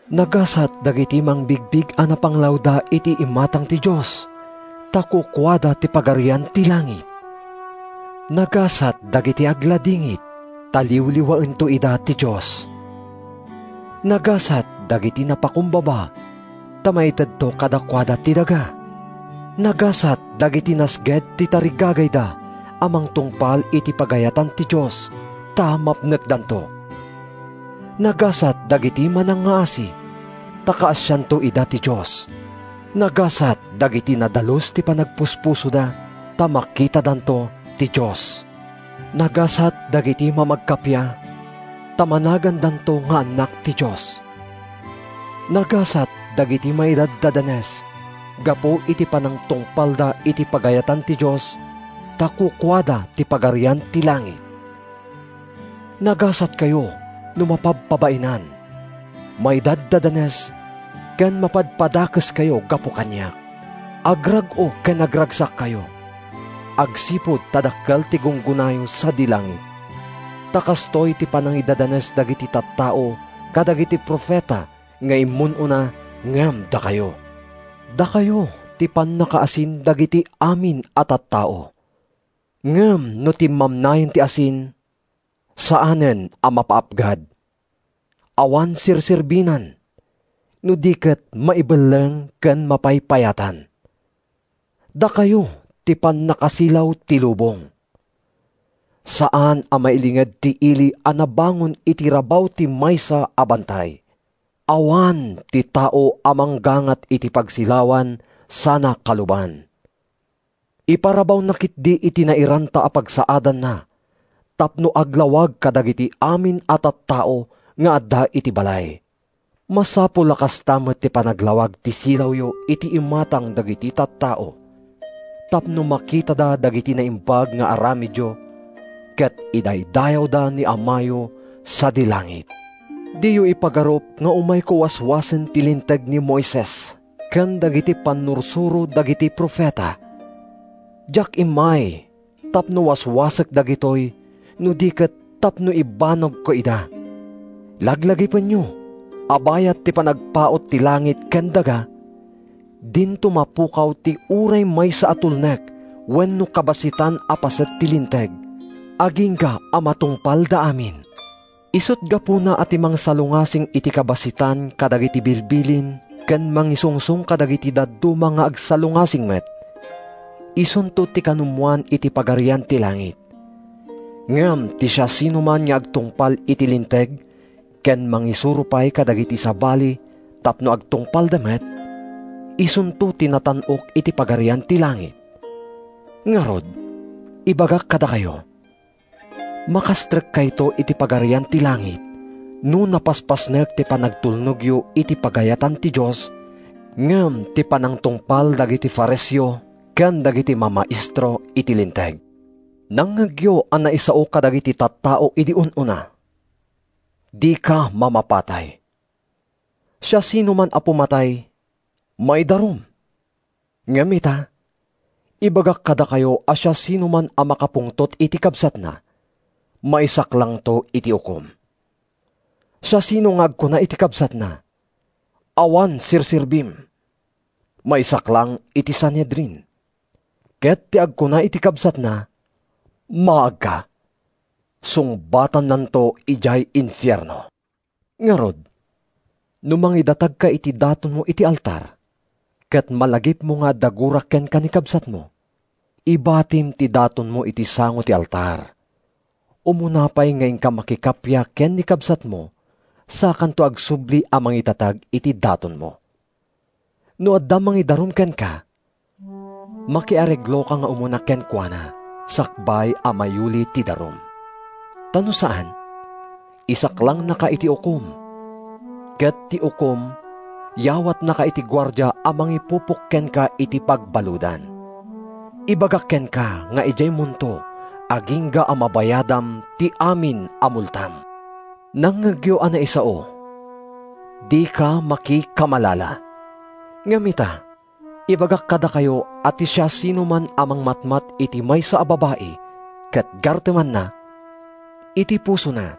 “Nagasat dagiti mangbigbig a napanglawda iti imatang ti Dios, ta kukuada ti Pagarian ti Langit. “Nagasat dagiti agladingit, ta liwliwaento ida ti Dios. “Nagasat dagiti napakumbaba, ta maitedto kadakuada ti daga. “Nagasat dagiti nasged ti tarigagayda a mangtungpal iti pagayatan ti Dios, ta mapnekdanto. “Nagasat dagiti manangngaasi, ta kaasianto ida ti Dios. “Nagasat dagiti nadalus ti panagpuspusoda, ta makitadanto ti Dios. “Nagasat dagiti mamagkakappia, ta managandanto nga annak ti Dios. “Nagasat dagiti maidadanes gapu iti panangtungpalda iti pagayatan ti Dios, ta kukuada ti Pagarian ti Langit. “Nagasatkayo no mapabpabainan, maidaddadanes ken mapadpadakeskayo gapu kaniak. Agrag-o ken agragsakkayo, agsipud ta dakkel ti gunggonayo sadi langit. Ta kastoy ti panangidadanes dagiti tattao kadagiti profeta nga immun-una ngem dakayo.” “Dakayo ti pannakaasin dagiti amin a tattao. Ngem no timmamnayen ti asin, saanen a mapaapgad. Awan serserbinan, no di ket maibelleng ken mapaypayatan. “Dakayo ti pannakasilaw ti lubong. Saan a mailinged ti ili a nabangon iti rabaw ti maysa a bantay. Awan ti tao a manggangat iti pagsilawan sana kaluban. Iparabawna ketdi iti nairanta a pagsaadanna tapno aglawag kadagiti amin a tattao nga adda iti balay. Masapul a kasta met ti panaglawag ti silawyo iti imatang dagiti tattao, tapno makitada dagiti naimbag nga aramidyo ket idaydayawda ni Amayo sadi langit.” “Diyo ipagarup nga umayko waswasen ti Linteg ni Moises ken dagiti pannursuro dagiti profeta. Diak immay tapno waswasek dagitoy no di ket tapno ibanagko ida. Laglagipenyo a bayat ti panagpaut ti langit ken daga, dinto mapukaw ti uray maysa a tulnek wenno kabassitan a paset ti Linteg, agingga a matungpalda amin. Isut’ gapuna a ti mangsalungasing iti kabassitan kadagiti bilbilin ken mangisungsong kadagiti dadduma nga agsalungasing met, isunto ti kanumoan iti Pagarian ti Langit. Ngem ti siasinoman nga agtungpal iti Linteg ken mangisuro pay kadagiti sabali tapno agtungpalda met, isunto ti natan-ok iti Pagarian ti Langit. Ngarud, ibagak kadakayo: makastrekkayto iti Pagarian ti Langit no napaspasnek ti panagtulnogyo iti pagayatan ti Dios ngem ti panagtungpal dagiti Fariseo ken dagiti mamaestro iti Linteg.” “Nangngegyo a naisao kadagiti tattao idi un-unana: ‘Dika mamapatay. Siasinoman a pumatay, maidarum.’ Ngem ita, ibagak kadakayo a siasinoman a makapungtot iti kabsatna, maisaklangto iti ukom. Siasinoman nga agkuna iti kabsatna: ‘Awan serserbim,’ maisaklang iti Sanhedrin; ket ti agkuna iti kabsatna, ‘Maagka,’ sungbatannanto idiay infierno. Ngarud, no mangidatagka iti datonmo iti altar, ket malagipmo nga adda gura kenka ni kabsatmo, ibatim ti datonmo iti sango ti altar; umuna pay nga inka makikappia ken ni kabsatmo sakanto agsubli a mangidatag iti datonmo. “No adda mangidarum kenka, makiaregloka nga umuna kenkuana sakbay a mayuli ti darum. Ta no saan, isaklangnaka iti ukom, ket ti ukom yawatnaka iti guardia a mangipupok kenka iti pagbaludan. Ibagak kenka nga idiaymonto agingga a mabayadam ti amin a multam.” “Nangngegyo a naisao: ‘Dika makikamalala.’ Ngem ita, ibagak kadakayo a ti siasinoman a mangmatmat iti maysa a babai, ket gartemanna, iti pusona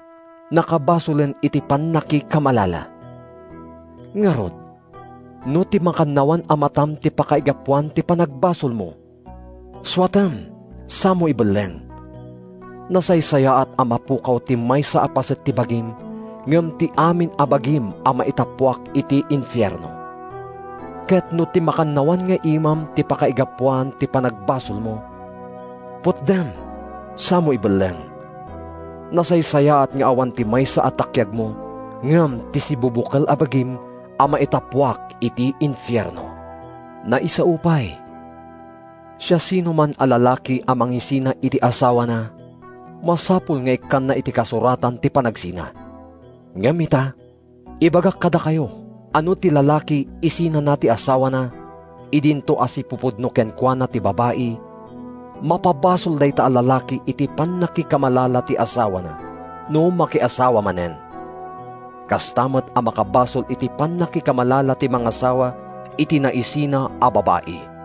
nakabasolen iti pannakikamalala. Ngarud, no ti makannawan a matam ti pakaigapuan ti panagbasolmo, suatem samo ibelleng. Nasaysayaat a mapukaw ti maysa a paset ti bagim ngem ti amin a bagim a maitappuak iti infierno. Ket no ti makannawan nga imam ti pakaigapuan ti panagbasolmo, putdem samo ibelleng. Nasaysayaat nga awan ti maysa a takkiagmo ngem ti sibubukel a bagim a maitappuak iti infierno.” “Naisao pay: ‘Siasinoman a lalaki a mangisina iti asawana, masapul nga ikkanna iti kasuratan ti panagsina.’ Ngem ita, ibagak kadakayo a no ti lalaki isinana ti asawana, idinto a sipupudno kenkuana ti babai, mapabasol dayta a lalaki iti pannakikamalala ti asawana no makiasawa manen. Kasta met a makabasol iti pannakikamalala ti mangasawa iti naisina a babai.”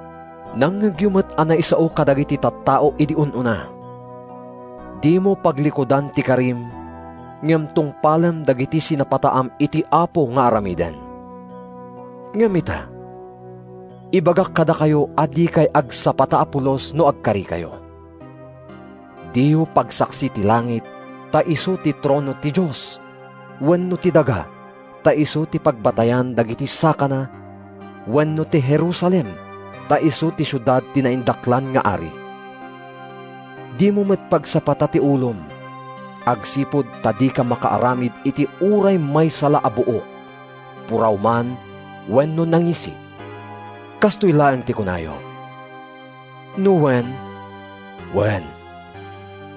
“Nangngegyo met a naisao kadagiti tattao idi un-unana, ‘Dimo paglikudan ti karim, ngem tungpalem dagiti sinapataam iti Apo nga aramiden.’ Ngem ita, ibagak kadakayo a dikay agsapata a pulos no agkarikayo. Diyo pagsaksi ti langit ta isu ti trono ti Dios, wenno ti daga ta isu ti pagbatayan dagiti sakana wenno ti Jerusalem ta isu ti siudad ti naindaklan nga Ari. Dimo met pagsapata ti ulom, agsipud ta dika makaaramid iti uray maysa la a buok, puraw man wenno nangisit. Kastoy laeng ti kunayo: no wen, ‘Wen;’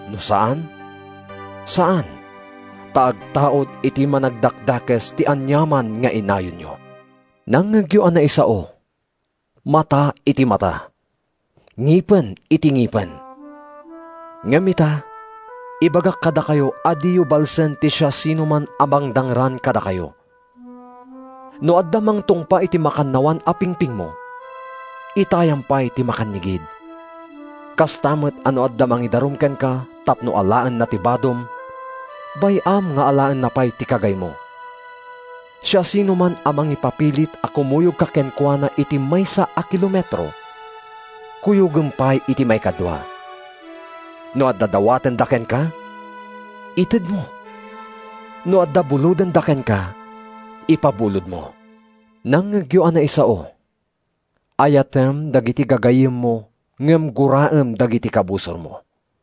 no saan, ‘Saan,’ ta agtaud iti Managdakdakes ti aniaman nga inayonyo.” “Nangngegyo a naisao, ‘Mata iti mata; ngipen iti ngipen.’ Ngem ita, ibagak kadakayo a diyo balsen ti siasinoman a mangdangran kadakayo. No adda mangtungpa iti makannawan a pingpingmo, itayam pay ti makannigid. Kasta met a no adda mangidarum kenka tapno alaenna ti badom, bay-am nga alaenna pay ti kagaymo. Siasinoman a mangipapilit a kumuyogka kenkuana iti maysa a kilometro, kuyogem pay iti maikadua. No adda dawatenda kenka, itedmo; no adda bulodenda kenka, ipabulodmo.” “Nangngegyo a naisao, ‘Ayatem dagiti gagayyemmo ngem guraem dagiti kabusormo.’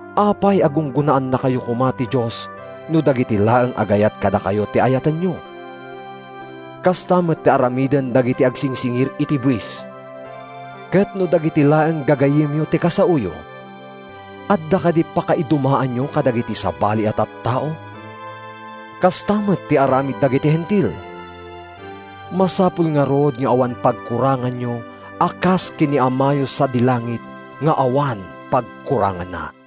Apay a gunggonaannakayo koma ti Dios no dagiti laeng agayat kadakayo ti ayatenyo? Kasta met ti aramiden dagiti agsingsingir iti buis! Ket no dagiti laeng gagayyemyo ti kasaoyo, adda kadi pakaidumaanyo kadagiti sabali a tattao? Kasta met ti aramid dagiti Hentil! Masapul ngarud nga awan pagkuranganyo a kas ken ni Amayo sadi langit nga awan pagkuranganna.”